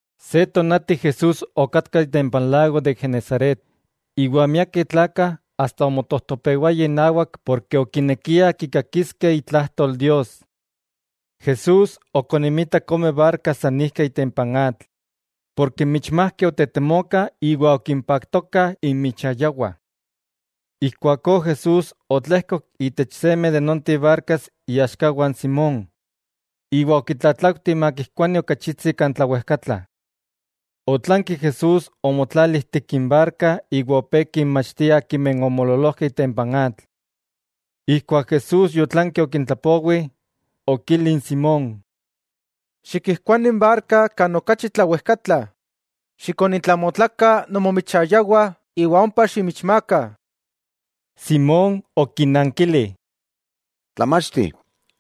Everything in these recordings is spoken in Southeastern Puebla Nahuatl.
Se tonati Jesús oyá itempa n lago de Genesaret, iwa miakeh tlakah asta omotojtopewayah inawak ken okinekiah kikakiskeh itlajtol Dios. Jesús okoninmitak ome barkas san ijkeh itempa n atl, porke n michmajkeh otetemokah iwa okimpaktokah inmichayawah. Ijkuakó Jesús otlejkok itech seme de nonteh barkas iaxkawah n Simón, iwa okitlatlaujti makijkuani ok achitsi kan tlawejkatla. Otlanki Jesús omotlali ijtik n barka iwa opé kinmachtia akimeh omoololojkeh itempa n atl. Ijkuak Jesús yotlanki okintlapowi, okili n Simón: —Xikijkuani n barka kan okachi tlawejkatla, xikonintlamotlakah nomomichayawah iwa ompa ximichmaakah. Simón okinankili: —Tlamachti,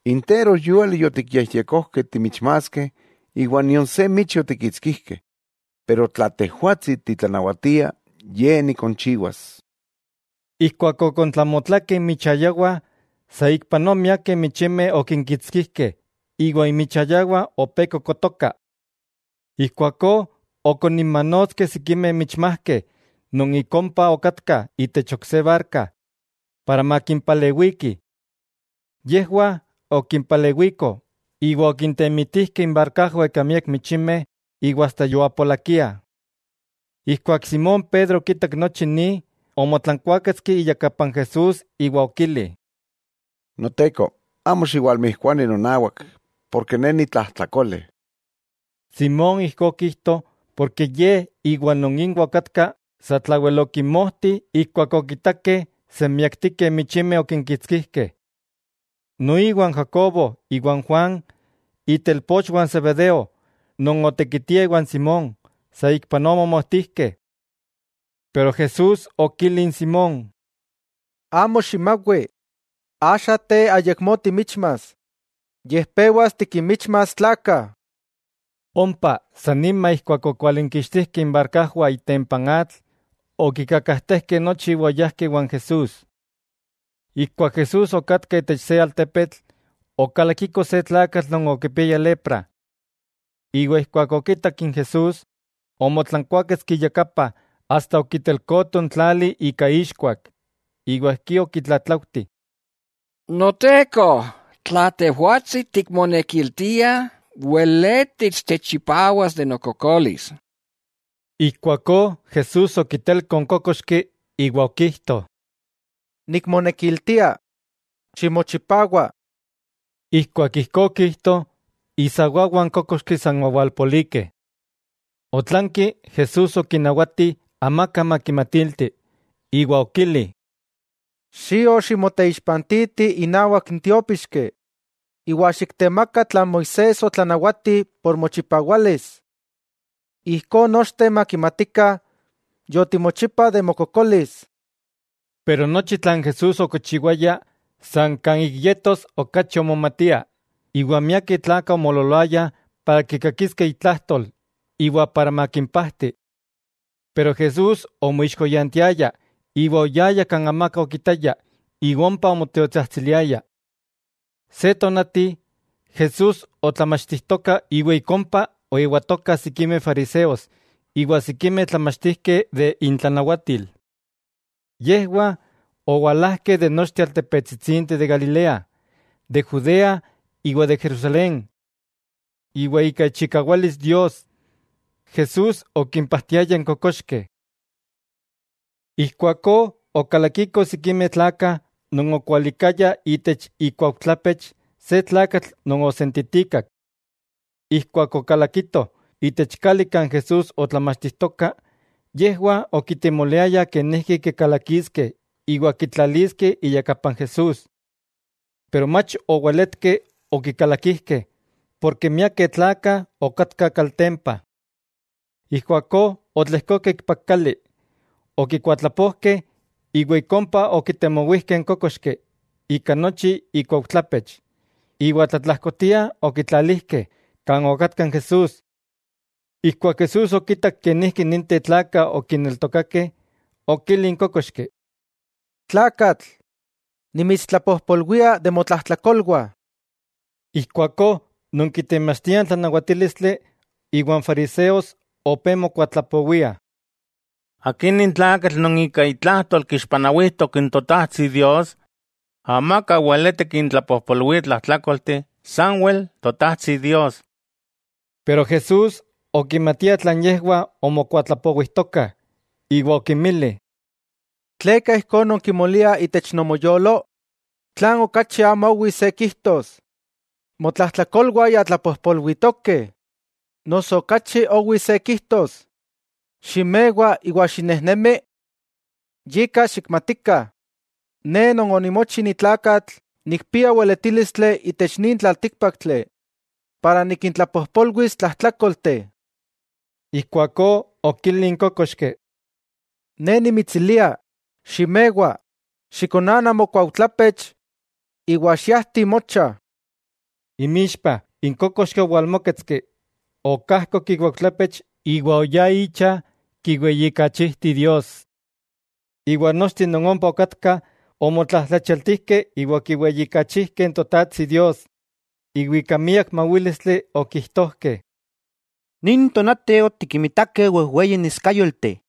interojyúali yotikyejyekojkeh timichmaaskeh iwa nion se michi otikkitskijkeh, pero tla Tejwatsi titlanawatia, ye nikonchiwas. Ijkuak okontlamotlakeh inmichayawah, saikpanoa miakeh michimeh okinkitskijkeh iwa inmichayawah opé kokotokah. Ijkuakó okoninmanotskeh sikimeh michmajkeh non ik ompa okatkah itech ok se barka, para makimpalewikih. Yejwah okimpalewikoh, iwa okintemitijkeh inbarkajwah ika miak michimeh iwa asta yoapolakiah. Ijkuak Simón Pedro okitak nochi ni, omotlankuáketski iyakapa n Jesús iwa okili: —Noteko, amo xiwalmijkuani nonawak, porke ne nitlajtlakole. Simón ijkó okijto porke Ye iwa non inwah okatka satlawel okinmojtih ijkuak okitakeh senmiaktikeh michimeh okinkitskijkeh. Noiwa n Jacobo iwa n Juan, itelpochwah n Zebedeo non otekitiah iwa n Simón, saikpanoa omomojtijkeh. Pero Jesús okili n Simón: —Amo ximawi, axa te ayakmó timichmas, yej pewas tikinmichmas tlakah. Ompa, san nima ijkuak okwalinkixtijkeh inbarkajwah itempa n atl, okikakajtejkeh nochi iwa oyajkeh iwan Jesús. Ijkuak Jesús okatka itech se altepetl, okalakiko se tlakatl non okipiaya lepra. Iwa ijkuak okitak n Jesús, omotlankuáketski iyakapa asta okitelkoto n tlali ika ixkuak, iwa ijkí okitlatlaujti: —Noteko, tla Tejwatsi tikmonekiltia, weletis techchipawas de nokokolis. Ijkuakó Jesús okitelko n kókoxki iwa okijto: —Nikmonekiltia. ¡Ximochipawa! Ijkuak ijkó okijto, isawawah n kókoxki san owalpolikeh. Otlanki Jesús okinawati amaka makimatilti, iwa okili: —Xio ximoteixpantiti inawak n tiópixki, iwa xiktemaka tlan Moisés otlanawati por mochipawalis. Ijkó nochteh makimatikah yotimochipa de mokokolis. Yika nochi tlan Jesús okichiwaya san kan ik yetos okachi omomatia, iwa miakeh tlakah omoololoayah para kikakiskeh itlajtol iwa para makimpajti. Pero Jesús omoixkoyantiaya, iwa oyaya kan amaka okitaya iwa ompa onmotiotsajtsiliaya. Se tonati, Jesús otlamachtijtoka iwa ik ompa oewatokah sikimeh fariseos iwa sikimeh tlamachtijkeh de intlanawatil. Yejwah owalajkeh de nochteh altepetsitsinteh de Galilea, de Judea iwa de Jerusalén. Iwa ika ichikawalis Dios, Jesús okimpajtiaya n kokoxkeh. Ijkuakó okalakikoh sikimeh tlakah non okualikayah itech ikuaujtlapech se tlakatl non osentitikak. Ijkuak okalakitoh itech kali kan Jesús otlamachtijtoka, yejwah okitemoliayah kenijki kikalakiskeh iwa kitlaliskeh iyakapa n Jesús. Pero mach oweletkeh okikalakijkeh, porke miakeh tlakah okatkah kaltempa. Ijkuakó otlejkokeh ikpak kali, okikuatlapojkeh, iwa ik ompa okitemowijkeh n kókoxki ika nochi ikuaujtlapech, iwa tlatlajkotia okitlalijkeh, kan okatka n Jesús. Ijkuak Jesús okitak kenijki ninteh tlakah okineltokakeh, okili n kókoxki: —Tlakatl, nimitstlapojpolwia de motlajtlakolwah. Ijkuakó non kitemachtiah n tlanawatílistli iwa n fariseos opé mokuatlapowiah: “¿Akí nin tlakatl non ika itlajtol kixpanawijtok n Totajtsi Dios?” Amaka weleti kintlapojpolwia tlajtlákolteh, sanwel Totajtsi Dios. Pero Jesús okimatia tlan yejwah omokuatlapowijtokah, iwa okinmili: —¿Tleka ijkó nonkimoliah itech nomoyolo? ¿Tlan okachi amo owi se kijtos: “Motlajtlakolwah ya tlapojpolwitokeh”, noso okachi owi se kijtos: “Ximewa iwa xinejnemi”? Yika xikmatikah, Ne Non onimochi ni tlakatl nikpia weletílistli itech nin tlaltíkpaktli para nikintlapojpolwis tlajtlakolteh. Ijkuakó okili n kókoxki: —Ne nimitsilia, ximewa, xikonana mokuaujtlapech iwa xiajti mocha. Inmixpah, n kókoxki owalmóketski, okajkok ikuaujtlapech iwa oyá icha kiweyijkachijti Dios. Iwa nochteh non ompa okatkah omotlajtlachialtijkeh iwa okiweyijkachijkeh Totajtsi Dios, iwa ika miak mawílistli okijtojkeh: —Nin tonati otikinmitakeh wejweyi neskayolteh.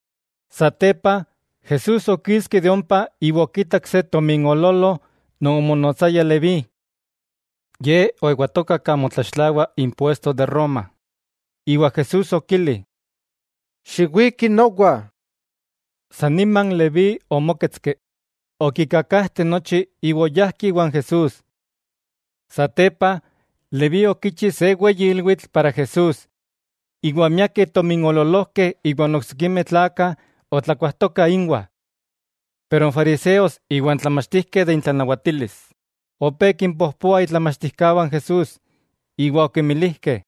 Satepa, Jesús okiski de ompa iwa okitak se tominoololo non omonotsaya Leví. Ye oewatoka kan motlaxtlawa impuesto de Roma, iwa Jesús okili: —Xiwiki nowa. San nima n Leví omóketski, okikakajte nochi iwa oyá iwan Jesús. Satepa, Leví okichi se weyi ilwitl para Jesús, iwa miakeh tominoololojkeh iwa n oksikimeh tlakah otlakuajtokah inwah. Pero n fariseos iwa n tlamachtijkeh de intlanawatilis, opé kimpojpoah itlamachtijkawah n Jesús, iwa okimilijkeh: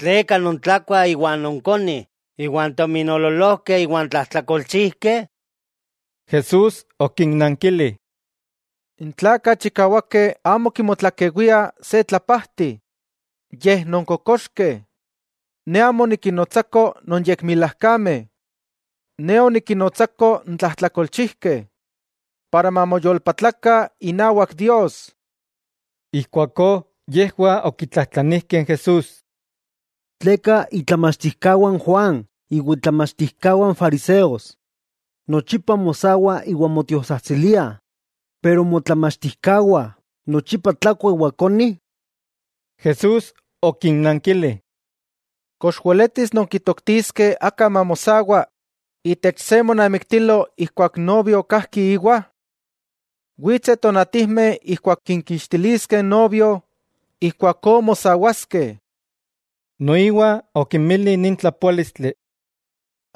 —¿Tleka nontlakuah iwa nonkonih iwan tominoololojkeh iwa n tlajtlakolchijkeh? Jesús okinnankili: —N tlakah chikawakeh amo kimotlakewiah se tlapajti, yej non kokoxkeh. Ne amo onikinnotsako non yekmilajkameh. Ne onikinnotsako n tlajtlakolchijkeh, para mamoyolpatlakah inawak Dios. Ijkuakó yejwah okitlajtlanijkeh n Jesús: —¿Tleka itlamachtijkawah n Juan iwa itlamachtijkawah n fariseos nochipa mosawah iwa motiotsajtsiliah, pero motlamachtijkawah nochipa tlakuah iwa konih? Jesús okinnankili: —¿Kox weletis nonkitoktiskeh aka mamosawa itech se monamiktilo ijkuak n novio kajki íwa? Witseh tonatijmeh ijkuak kinkixtiliskeh n novio, ijkuakó mosawaskeh. Noiwa okinmili nin tlapoálistli: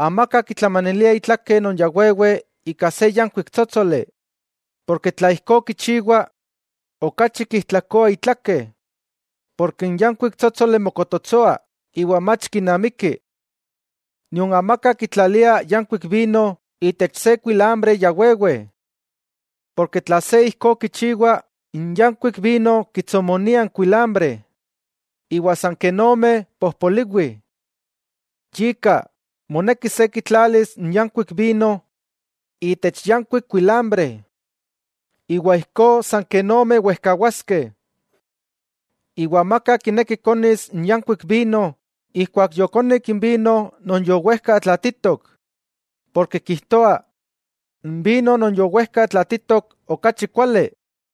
—Amaka kitlamanilia itlake non ya wewe ika se yankuik tsótsoli. Porke tla ijkó kichiwa, okachi kijtlakoa itlake, porke n yankuik tsótsoli mokototsoa iwa mach kinamiki. Nion amaka kitlalia yankuik vino itech se kuilambre ya wewe. Porke tla se ijkó kichiwa, n yankuik vino kitsomonia n kuilambre, iwa san ken omeh pojpoliwih. Yika, moneki se kitlalis n yankuik vino itech yankuik kuilambre, iwa ijkó san ken omeh wejkawaskeh. Iwa amaka kineki konis n yankuik vino ijkuak yokonik n vino non yowejka tlatitok, porke kijtoa: “N vino non yowejka tlatitok okachi kuali.”